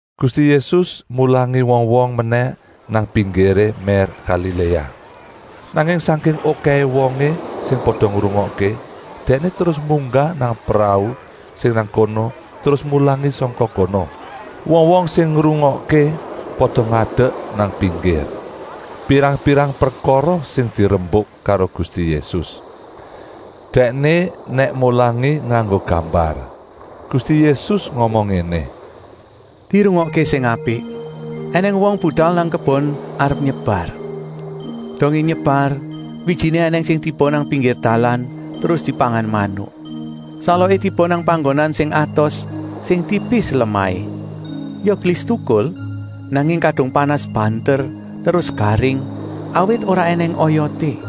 Gusti Yésus mulangi wong-wong menèh nang pinggiré mér Galiléa. Nanging sangking okèhé wongé sing pada ngrungokké, Dèkné terus munggah nang prau sing nang kono terus mulangi sangka kono. Wong-wong sing ngrungokké pada ngadek nang pinggir. Pirang-pirang prekara sing dirembuk karo Gusti Yésus. Dèkné nèk mulangi nganggo gambar. Gusti Yésus ngomong ngéné: “Dirungokké sing apik. Enèng wong budal nang kebon arep nyebar. Dongé nyebar, wijiné ènèng sing tiba nang pinggir dalan terus dipangan manuk. Saloké tiba nang panggonan sing atos, sing tipis lemahé. Ya gelis tukul, nanging kadung panas banter terus garing, awit ora ènèng oyoté.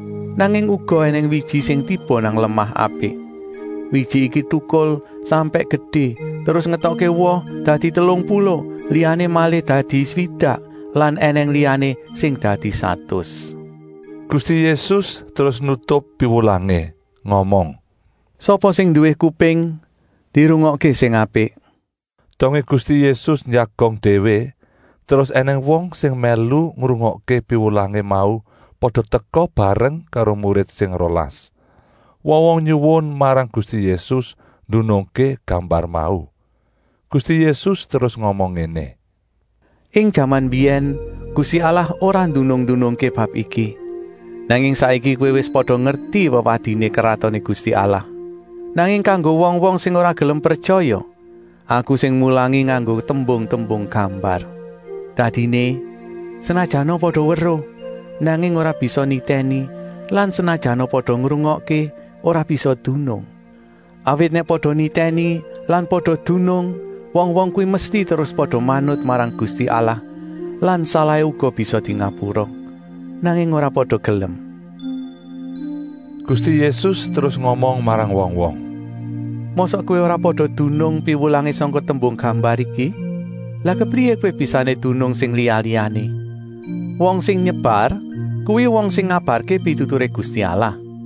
Nanging uga ènèng wiji sing tiba nang lemah apik. Wiji iki tukul sampèk gedé terus ngetokké woh dadi telung puluh, liyané malih swidak lan ènèng liyané sing dadi satus.” Gusti Yésus terus nutup piwulangé ngomong: “Sapa sing nduwé kuping, dirungokké sing apik!” Dongé Gusti Yésus njagong déwé, terus ènèng wong sing mèlu ngrungokké piwulangé mau pada teka bareng karo murid sing rolas. Wong-wong nyuwun marang Gusti Yésus ndunungké gambar mau. Gusti Yésus terus ngomong ngéné: “Ing jaman mbiyèn Gusti Allah ora ndunung-ndunungké bab iki, nanging saiki kowé wis pada ngerti wewadiné Kratoné Gusti Allah. Nanging kanggo wong-wong sing ora gelem pretyaya, Aku sing mulangi nganggo tembung-tembung gambar. Dadiné, ‘Senajana pada weruh, nanging ora bisa nitèni lan senajana pada ngrungokké ora bisa dunung. Awit nèk pada nitèni lan pada dunung, wong-wong kuwi mesti terus pada manut marang Gusti Allah lan salahé uga bisa dingapura. Nanging ora pada gelem.’” Gusti Yésus terus ngomong marang wong-wong: “Mosok kowé ora pada dunung piwulangé sangka tembung gambar iki? Lah kepriyé kowé bisané dunung sing liya-liyané? Wong sing nyebar kuwi wong sing ngabarké pituturé Gusti Allah.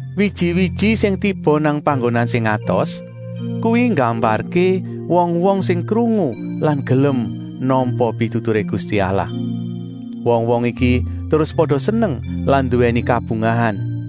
Wiji-wiji sing tiba nang panggonan sing atos, kuwi nggambarké wong-wong sing krungu lan gelem nampa pituturé Gusti Allah. Wong-wong iki terus pada seneng lan nduwèni kabungahan.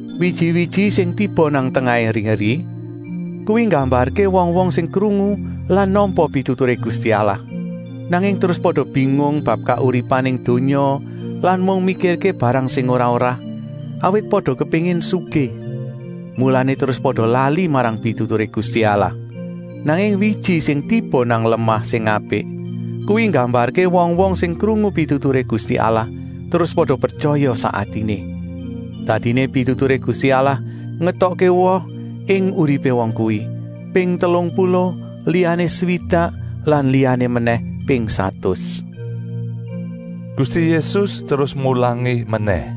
Wiji-wiji sing tiba nang tengahé eri-eri kuwi nggambarké wong-wong sing krungu lan nampa pituturé Gusti Allah. Nanging terus pada bingung bab kauripan ing donya lan mung mikirké barang sing ora-ora, awit pada kepéngin sugih. Mulané terus pada lali marang pituturé Gusti Allah. Nanging wiji sing tiba nang lemah sing apik kuwi nggambarké wong-wong sing krungu pituturé Gusti Allah terus pada pretyaya sak atiné. Dadiné pituturé Gusti Allah ngetokké woh ing uripé wong kuwi, ping telung puluh, liyané swidak lan liyané menèh ping satus.” Gusti Yésus terus mulangi menèh: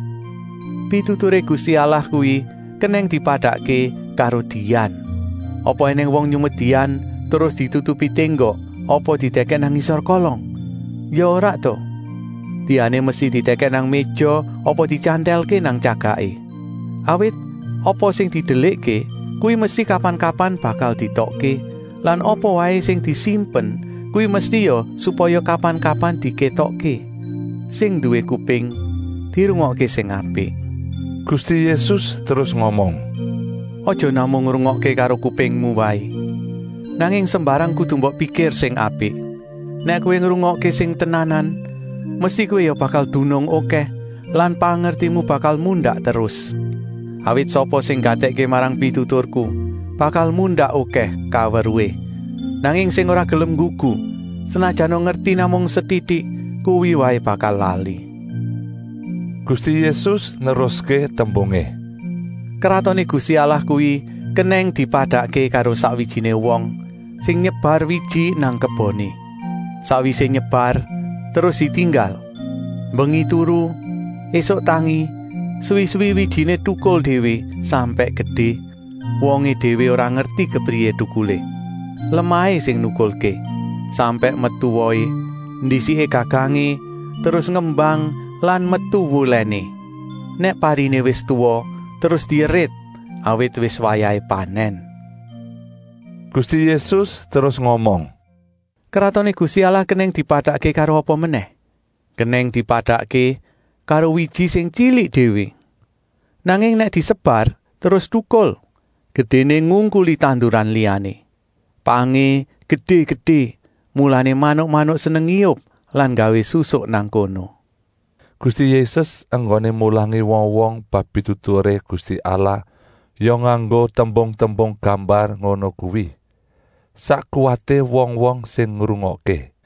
“Pituturé Gusti Allah kuwi kenèng dipadakké karo dian. Apa ènèng wong nyumet dian terus ditutupi ténggok apa didèkèk nang ngisor kolong? Ya ora ta! Diané mesti didèkèk nang méja apa dityantèlké nang tyagaké. Awit apa sing didelikké kuwi mesti kapan-kapan bakal dietokké lan apa waé sing disimpen kuwi mesti ya supaya kapan-kapan dikétokké. Sing nduwé kuping, dirungokké sing apik.” Gusti Yésus terus ngomong: “Aja namung ngrungokké karo kupingmu waé, nanging sembarang kudu mbok pikir sing apik. Nèk kowé ngrungokké sing tenanan, mesti kowé ya bakal dunung okèh lan pangertimu bakal mundak terus. Awit sapa sing nggatèkké marang pituturku bakal mundak okèh kaweruhé, nanging sing ora gelem nggugu, senajana ngerti namung setitik, kuwi waé bakal lali.” Gusti Yésus neruské tembungé: “Kratoné Gusti Allah kuwi kenèng dipadakké karo sakwijiné wong sing nyebar wiji nang keboné. Sakwisé nyebar terus ditinggal, mbengi turu, ésuk tangi, suwi-suwi wijiné tukul déwé sampèk gedé, wongé déwé ora ngerti kepriyé tukulé! Lemahé sing nukulké, sampèk metu wohé, ndisiké gagangé, terus ngembang lan metu wulèné. Nèk pariné wis tuwa terus dierit, awit wis wayahé panèn.” Gusti Yésus terus ngomong: “Kratoné Gusti Allah kenèng dipadakké karo apa menèh? Kenèng dipadakké karo wiji sing tyilik déwé. Nanging nèk disebar terus tukul, gedéné ngungkuli tanduran liyané. Pangé gedé-gedé, mulané manuk-manuk seneng ngiyup lan nggawé susuk nang kono.” Gusti Yésus enggoné mulangi wong-wong bab pituturé Gusti Allah ya nganggo tembung-tembung gambar ngono kuwi, sak kuwaté wong-wong sing ngrungokké.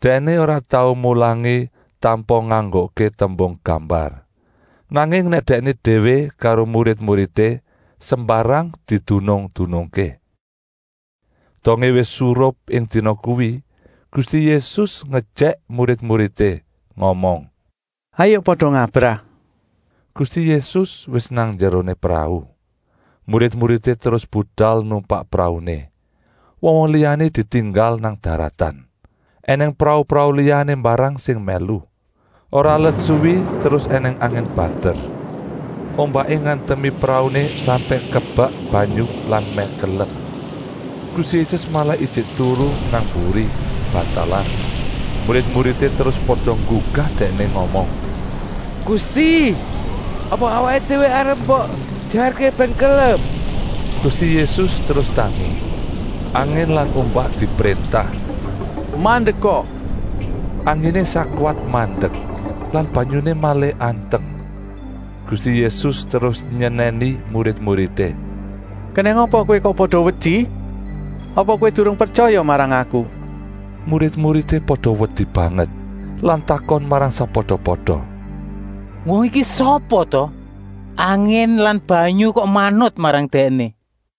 Dèkné ora tau mulangi tanpa nganggokké tembung gambar. Nanging nèk Dèkné déwé karo murid-muridé, sembarang didunung-dunungké. Dongé wis surup ing dina kuwi, Gusti Yésus ngejèk murid-muridé, ngomong: “Hayuk pada ngabrah!” Gusti Yésus wis nang njeroné prau. Murid-muridé terus budal numpak prauné, wong-wong liyané ditinggal nang daratan. Enèng prau-prau liyané mbarang sing mèlu. Ora let suwi terus ènèng angin banter. Ombaké ngantemi prauné sampèk kebek banyu lan mèh kelep. Gusti Yésus malah ijik turu nang mburi, bantalan. Murid-muridé terus pada nggugah Dèkné ngomong: “Gusti, apa awaké déwé arep mbok ejarké bèn kelep?” Gusti Yésus terus tangi. Angin lan ombak dipréntah: “Mandeka!” Anginé sakwat mandek lan banyuné malih anteng. Gusti Yésus terus nyenèni murid-muridé: “Kenèng apa kowé kok pada wedi? Apa kowé durung pretyaya marang Aku?” Murid-muridé pada wedi banget lan takon marang sakpada-pada: “Wong iki sapa ta? Angin lan banyu kok manut marang Dèkné?”